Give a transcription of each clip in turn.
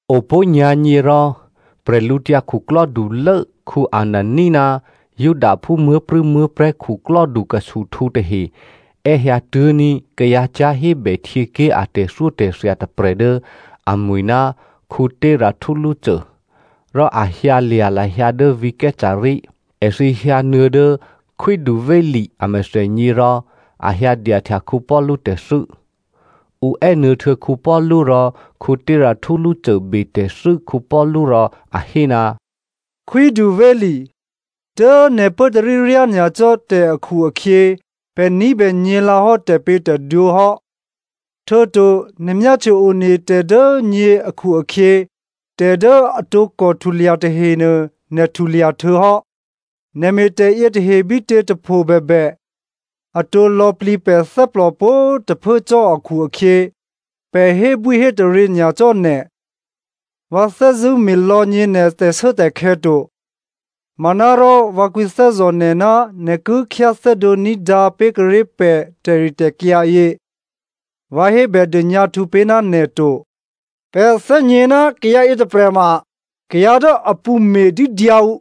Opó̤ nyǎ̤nyě rò, bwídukhulố Anania ná Judaphú muố̤prû̌muố̤prè̤́ khuklò́dukhusuhtǔ tahe è́hyǎtố̤ní̤ ná kayǎ cyá̤hébè htyěké̤ a tè̤thyótè̤thya tôprè̤ dố amwi̤ ná Tertullo, rò a hyǎlya̤ lahyǎ dố vǐ̤ Caesarea. Èthǐ hyǎnuô̌ dố khwídu Felice amèthènyě rò a hyǎdyahtya Paulu tè̤thû́. Ǔ è́nuô̌htuô̌ Paulu rò Tertullo betè̤thû́ Paulu rò a hé, “Khwídu Felice, dố nè̤ pốtarí ryányacò́ tè̤ akhu-akhyě pè̤ ní̤bè nyě̤lǎhò́ tè̤pě̤tè̤dwǒ hò́. Htuô̌to nè̤ myáhtye one tè̤ dố nyě akhu-akhyě tè̤ dố a tǒkò htulya tahenuô nè̤ htulya htuô̌hò́. Nè̤ me̤tè̤ yětahe bítětôpho bèbè, atǒ lò̌plǐ pè̤ thè́plò pwǒ̤꤮ tôphuố cò́ akhu-akhyě, pè̤ hébwíhétaryě nyacò́ nè̤. Vǎ thè́zṳ̂́ me̤lò̌ nyě̤ nè̤ tè̤shuốtè̤khè̌ to. Manárò vǎ kwǐthè́zò̤ nè̤ ná nè̤ ki khyáthè́dǒ ní̤dǎ pé̤kuô̌ré̤ pè̤ tè̤ritè̤kyǎ yě. Vǎ hébèdônyǎhtǔ pé̤ ná nè̤ to. “Pè̤ thè́gně ná kayǎ yětôprè̤ ma kayǎ dố a pṳ̌ me̤dídyǎ ǔ.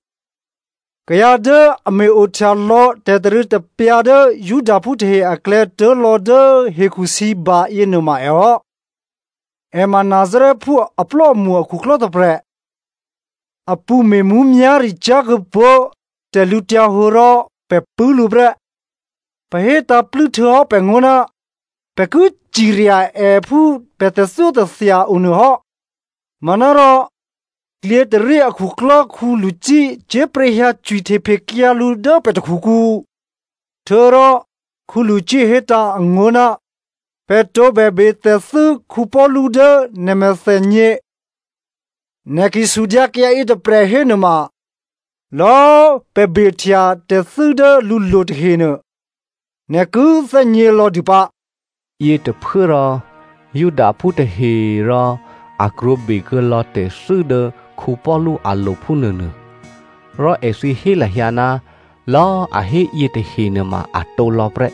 Kayǎ dố a me̤-ohtyalò̌ tè̤tarû̌tapyǎ dố Judaphú tahe aklè̌ tuố̤lò̌ dố hekhusǐba yěnuôma èhò́. È ma Nazarèphú aplò́amṳ akhuklò́ tôprè̤. A pṳ̌ me̤ mǔmyá̤ricyá̤ kuô̌pó̤ tè̤lǔhǒdu rò pè̤ pṳ̂́ lǔ prè́. (Pè̤ hétǎ̤plû́ htuô̌hò́ pè̤ngó̤ ná pè̤ ki cirya è phú pè̤ tè̤thyótè̤thya o nuô hò́. Manárò, klyětôrí akhuklò́ Lysia cyé̤pryě̤ hyǎ cwihtephekyǎ lǔ dố pè̤ takhukǔ. Htuô̌rò Lysia hétǎ̤ angó̤ ná pè̤ tǒbè betè̤thû́ Paulu dố nè̤ mèthènyě.) Nè̤ ki sudyǎ kayǎ yětôprè̤ hénuôma, lò̌꤮ pè̤ behtya tè̤thû́ dố lǔlo̤ tahenuô, nè̤ ki thè́gnělò̌ dû pǎ.” Yětôphuốrò, Judaphú tahe꤮ rò a krwǒ bekuô̌lò̌ tè̤thû́ dố Paulu alo̤ phúnuônuô. Rò èthǐ hé lahyǎ ná lò̌꤮ a hé yětahe nuôma a tǒlò̌ prè́.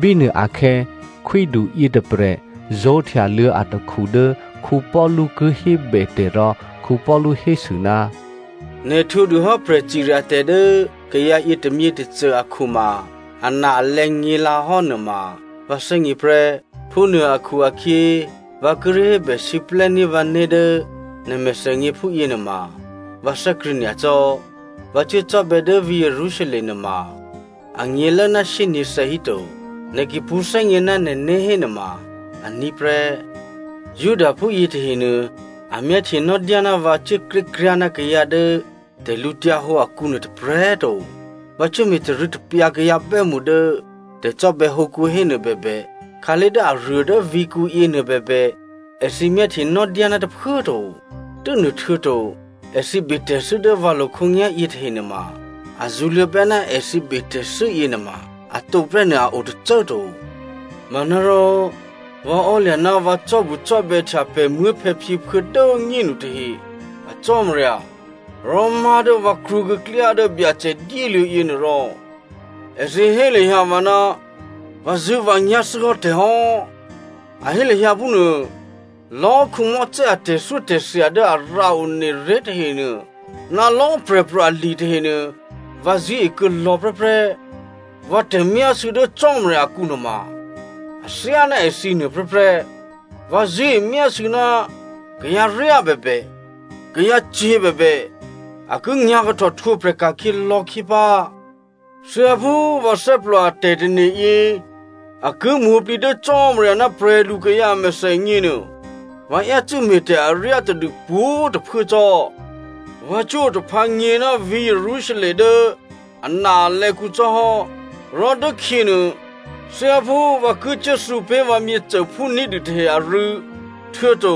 Bínuôakhè̌ khwídu yětôprè̤ zó̤htyaluô̌ atakhu dố Paulu ki hébè tè̤ rò Paulu hésû, “Nè̤ htwǒdûhò́ prè̤cirya tè̤ dố kayǎ yětômyětôcô akhu ma ana-alè̌ nyě̤lǎhò́ nuôma vǎ thè́gně prè́. Phúnuô akhu-akhyě, vǎ kíré̤ hébèsiplè́ní̤ vǎné̤ dố nè̤ mèthènyě phúyěnuôma, vǎ thè́krṳ̂̌ nyacò́. Vǎ cuốcò́bè̌ dố vǐ̤ Jerusalem nuôma anyě̤lố ná shyényě̤thè̌ híto. Nè̤ ki pṳ̌thè́gně ná nè̤né̤ hénuôma aní̤ prè́. Judaphú yětahenuô a myáhtyenò́ná vǎ cuốkrékryá̤ ná kayǎ dố tè̤lǔhǒdu akǔnuô tôprè̤꤮ to, vǎ cuốme̤ tarû̌tapyǎ kayǎ bè́mṳ dố tè̤cò́bè̌hǒkǔ hénuô bèbè, khǎlé̤ dố aruô dố vǐ̤kǔyě nuôbèbè, èthǐ myáhtyenò́ná tôphuố꤮ to. Tû́nuôhtuô̌to èthǐ betè̤thû́ dố vǎlo̤ khǒnyá̤yě tahenuôma, a zṳ̌luô̌bè́ ná èthǐ betè̤thû́ yěnuôma a tǒprè́ nuô a o tôcô꤮ to. Manárò, vǎ ò́lya̤ ná vǎ cò́bucò́bè̌htya pè̤ muố̤phè̌phyěphuô̌ dố꤮ nyénu tahe a Cò́marya, rò má̤ dố vǎ krwǒkuô̌ klyá dố Byacè dyéluô̌ yěnuôrò èthǐ hé lahyǎ vǎ ná vǎzṳ̂́vǎnyá̤ thû́hò́ tè̤hò́, a hé lahyǎ phúnuô. Lò̌꤮ Mosè a tè̤thyótè̤thya dố a rǎone ré̤ tahenuô ná lò̌꤮ prè̤pro̤ ali tahenuô, vǎ zṳ̂́e kuô̌lò̌ prè́prè́. Vǎ tè̤myásû̌ dố Cò́marya akǔ nuôma athyáná èthǐ nuôprè́prè́. Vǎ zṳ̂́e myásû̌ ná kayǎryá bèbè, kayǎcyě̤ bèbè, a ki nyǎ̤kahtò htwǒprè̤ ka̤khyě lò̌khyě pǎ. Thyáphú vǎ thè́plò a tè̤tane̤yě a ki mwǒ̤plǐ dố Cò́marya ná prè̤lukayǎ a mèthènyě nuô, vǎ yácû́ me̤tè̤ aryá tadû pwǒ̤꤮ tôphuố cò́. “Vǎ cuốotaphǎ nyě̤ ná vǐ̤ Jerusalem dố ana, alè̌kǔ cò́hò́, rò dốkhyěnuô, thyáphú vǎ ki cuốthǔ pé̤ vǎ myěcôphú ní̤dû tahe arû̌, htuô̌to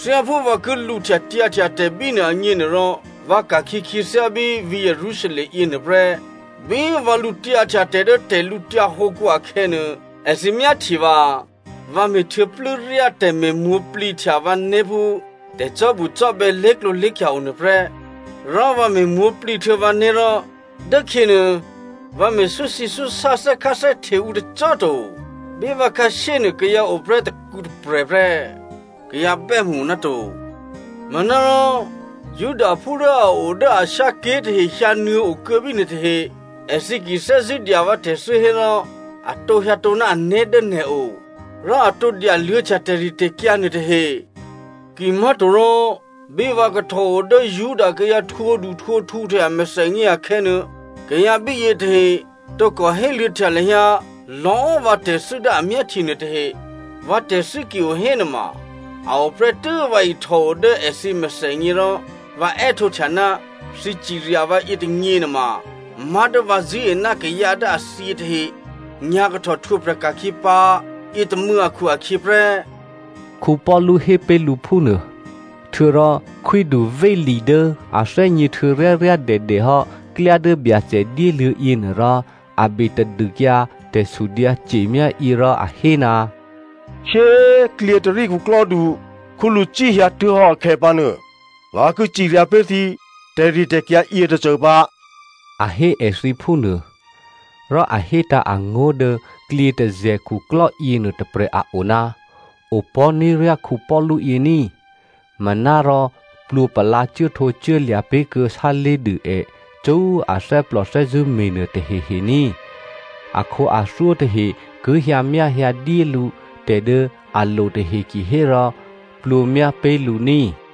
thyáphú vǎ ki lǔhtyatyǎhtya tè̤ bínuô agně nuôrò, vǎ ka̤khyě khyěthyá bí vǐ̤ Jerusalem yěnuô prè́. Bí vǎ lǔtyǎhtya tè̤ dố tè̤lǔtyǎ hǒkǔ akhè̌nuô, èthǐ myáhtye vǎ. Vǎ me̤ htuô̌plû́ryá tè̤me̤mwǒ̤plǐhtya vǎné̤ phú tè̤cò́bucò́bè̌ lé̤klǒlé̤khya o nuôprè́. Rò vǎ me̤mwǒ̤plǐ htuô̌ vǎné̤ rò, dốkhyěnuô vǎ me̤ súsǐsúsá thè́kháthè́hte ǔ tôcô꤮ to. Bí vǎ khǎshyénuô kayǎ oprè́ tôkǔtôprè̤ prè́, kayǎ bè́mṳ o ná to. Manárò Judaphú dố a o dố Asia ké̤ tahe hyǎnuô̌ okuô̌ bínuô tahe. Èthǐ ki thè́zṳ̂́ dya vǎ tè̤thû́ hérò a tǒ hyǎtǒ ná ané̤ dố nè̤o, rò a tǒ dyaluô̌htya tè̤ritè̤kyǎ nuôtahe. Kimá̤torò bí vǎ kahtòo dố Juda kayǎ htwǒduhtwǒkhu tahe a mèthènyě akhè̌nuô, kayǎ bíyě tahe tǒkò héluô̌htya lahyǎ lò̌꤮ vǎ tè̤thû́ dố a myáhtye nuôtahe. Vǎ tè̤thû́ ki o hénuôma a oprè́tû́ vǎ ihtòo dố èthǐ amèthènyě rò vǎ è́htǒhtya, ‘Thǐ cirya vǎ yětônyě nuôma má̤ dố vǎ zṳ̂́e ná kayǎ dố a thyě tahe nyǎ̤kahtò htwǒprè̤ ka̤khyě pǎ, yětômû̌ akhu-akhyě prè́,’” Paulu hé pé̤ lǔ phúnuô. Htuô̌rò khwídu Felice dố a thè́gně htuô̌ ryáryádèdèhò́ klyá dố Byacè dyéluô̌ yěnuôrò, a be tadûkyǎ tè̤sudyǎce̤myá yě rò a hé, “Shyé꤮ klyětôrí khuklò́du Lysia hyǎtuố̤hò́ akhè̌pǎnuô, vǎ ki cirya pé̤ thǐ tè̤ritè̤kyǎ yětôcô pǎ,” a hé èthǐ phúnuô. Rò a hétǎ̤ angó̤ dố klyětôzè̤ khuklò́ yěnuô tôprè̤ a o, opò̤́ní̤ryá Paulu yě ní꤮, manárò plwǒpalǎ cuốhtǒcuốlya̤ pé̤kuô̌ sálé̤dû è cṳ́꤮ athè́plò thè́zṳ̂́me̤nuô tahehe ní꤮. Akhǒathyó tahe ki hyǎmyáhyǎdyé lǔ tè̤ dố a lo tahe kihérò plwǒmyá pé̤ lǔ ní꤮.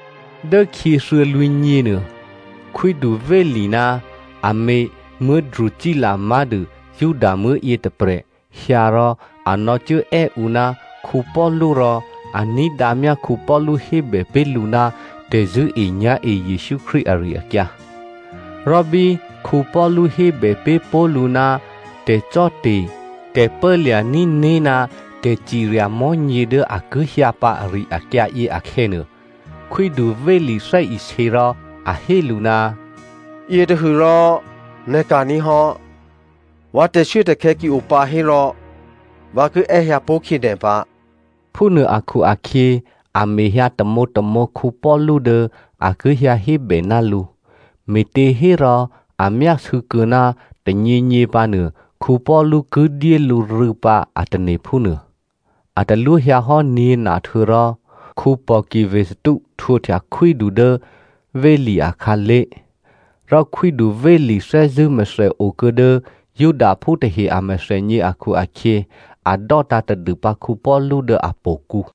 Dốkhyě thuô̌lwǐ̤nyěnuô, khwídu Felice ná amě Drusilla má̤dû Judamuố̤ yětôprè̤ hyǎ rò a nò̌cuốè́ ǔ ná Paulu rò a ní̤dǎmyá Paulu hébè pé̤ lǔ ná tè̤zṳ̂́enyá̤e Jesǔ Krístu ari-akyǎ. Rò bí Paulu hébè pé̤ pó̤ lǔ ná tè̤cò́te̤, tè̤pốlya̤ní̤ né̤ ná tè̤cirya mò̤́nyě dố a ki hyǎ pǎ ari-akyǎ yě akhè̌nuô, khwídu Felice thè́isě rò a hé lǔ, “Yětôhû rò nè̤ ka̤ní̤ hò́. Vǎ tè̤shuốtè̤khè̌ ki o pǎ hérò, vǎ ki è́hyǎpó̤ khyě nè̤ pǎ.” Phúnuô akhu-akhyě a mehyǎ tamǒtamǒ Paulu dố a ki hyǎhébè ná lǔ, me̤těhérò a myásû̌kuô̌ ná tônyěnyě pǎnuô, Paulu ki dyé lǔ rû̌ pǎ a tane̤ phúnuô. A talwó hyǎhò́ nyě̤na htuô̌rò, Pòki Festo htwǒhtya khwídu dố Felice akhǎlé̤, rò khwídu Felice thè́zṳ̂́ mèthèokuô̌ dố Judaphú tahe a mèthènyě akhu-akhyě a dò́tǎ̤ tadûpǎ Paulu dố htò̌kǔ.